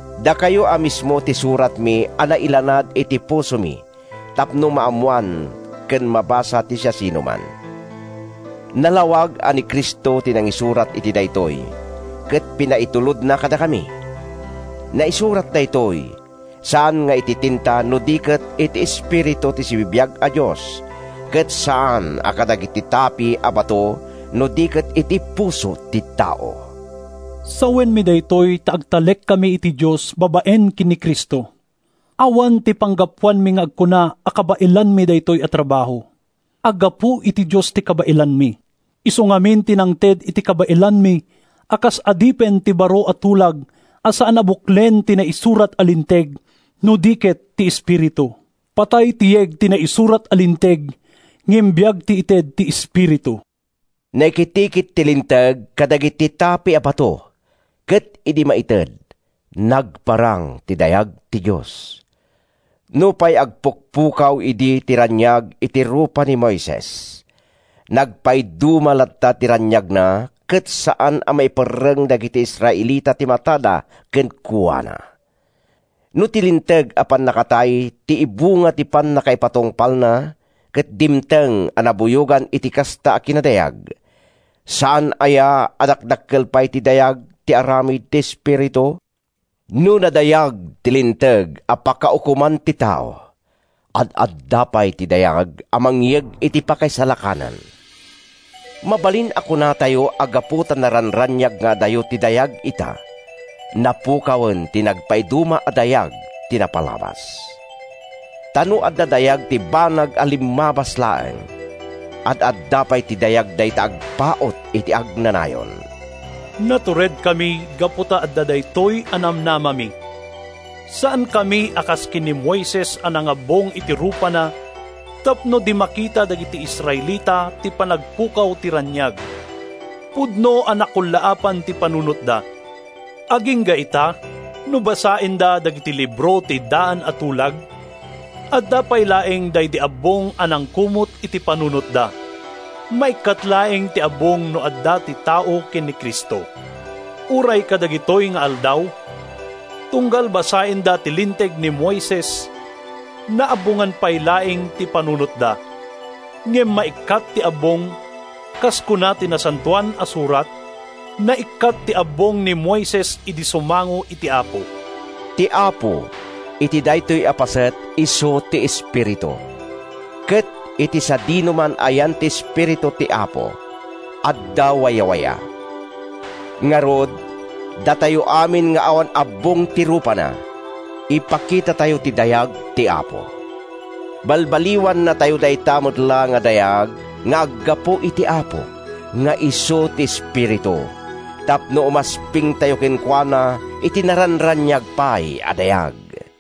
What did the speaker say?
Dakayo a mismo ti suratmi a nailanad iti pusomi tapno maammoan ken mabasa ti siasinoman. Nalawag a ni Cristo ti nangisurat iti daytoy ket pinaitulodna kadakami. Naisurat daytoy, saan nga iti tinta no di ket iti Espiritu ti sibibiag a Dios ket saan a kadagiti tapi a bato no di ket iti puso ti tao. Sawenmi daytoy ta agtalekkami iti Dios babaen ken ni Cristo. Awan ti panggapuanmi nga agkuna a kabaelanmi daytoy a trabaho. Aggapu iti Dios ti kabaelanmi. Isu ngamin ti nangted iti kabaelanmi a kas adipen ti baro a tulag a saan a buklen ti naisurat a linteg, no di ket ti Espiritu. Patay ti yeg ti naisurat a linteg, ngem biag ti ited ti Espiritu. Naikitikit ti Linteg kadagiti tapi a bato, ket idi maited, nagparang ti dayag ti Dios. Nupay agpukpukaw idi ti raniag iti rupa ni Moises, nagpaiduma latta ti raniagna ket saan a maiperreng dagiti Israelita ti matada kenkuana. No ti Linteg a pannakatay ti ibunga ti pannakaipatungpalna ket dimteng a nabuyogan iti kasta a kinadayag, saan aya a dakdakkel pay ti dayag ti aramid ti Espiritu? No nadayag ti Linteg a pakaukoman ti tao, ad-adda pay ti dayag a mangyeg iti pakaisalakanan! Mabalin a kunatayo a gapu ta naranraniag nga adayo ti dayag ita, napukawen ti nagpaiduma a dayag ti napalabas. Ta no adda dayag ti banag a limmabas laeng, ad-adda pay ti dayag dayta agpaut iti agnanayon. Naturedkami gapu ta adda daytoy a namnamami. Saankami a kas ken ni Moises a nangabbong iti rupana tapno di makita dagiti Israelita ti panagpukaw ti raniag. Pudno a nakullaapan ti panunotda. Agingga ita, no basaenda dagiti libro ti daan a tulag, adda pay laeng daydi abbong a nangkumot iti panunotda. Maikkat laeng ti abbong no adda ti tao ken ni Cristo. Uray kadagitoy nga aldaw, tunggal basaenda ti Linteg ni Moises, naabbongan pay laeng ti panunotda. Ngem maikkat ti abbong, kas kuna ti Nasantoan a Surat, “Naikkat ti abbong ni Moises idi sumango iti Apo.” “Ti Apo” iti daytoy a paset, isu ti Espiritu, ket iti sadinoman a yan ti Espiritu ti Apo, adda wayawaya. Ngarud, datayo amin nga awan abbong ti rupana, ipakitatayo ti dayag ti Apo. Balbaliwannatayo dayta met laeng a dayag nga aggapu iti Apo nga isu ti Espiritu tapno umaspingtayo kenkuana iti naranraniag pay a dayag.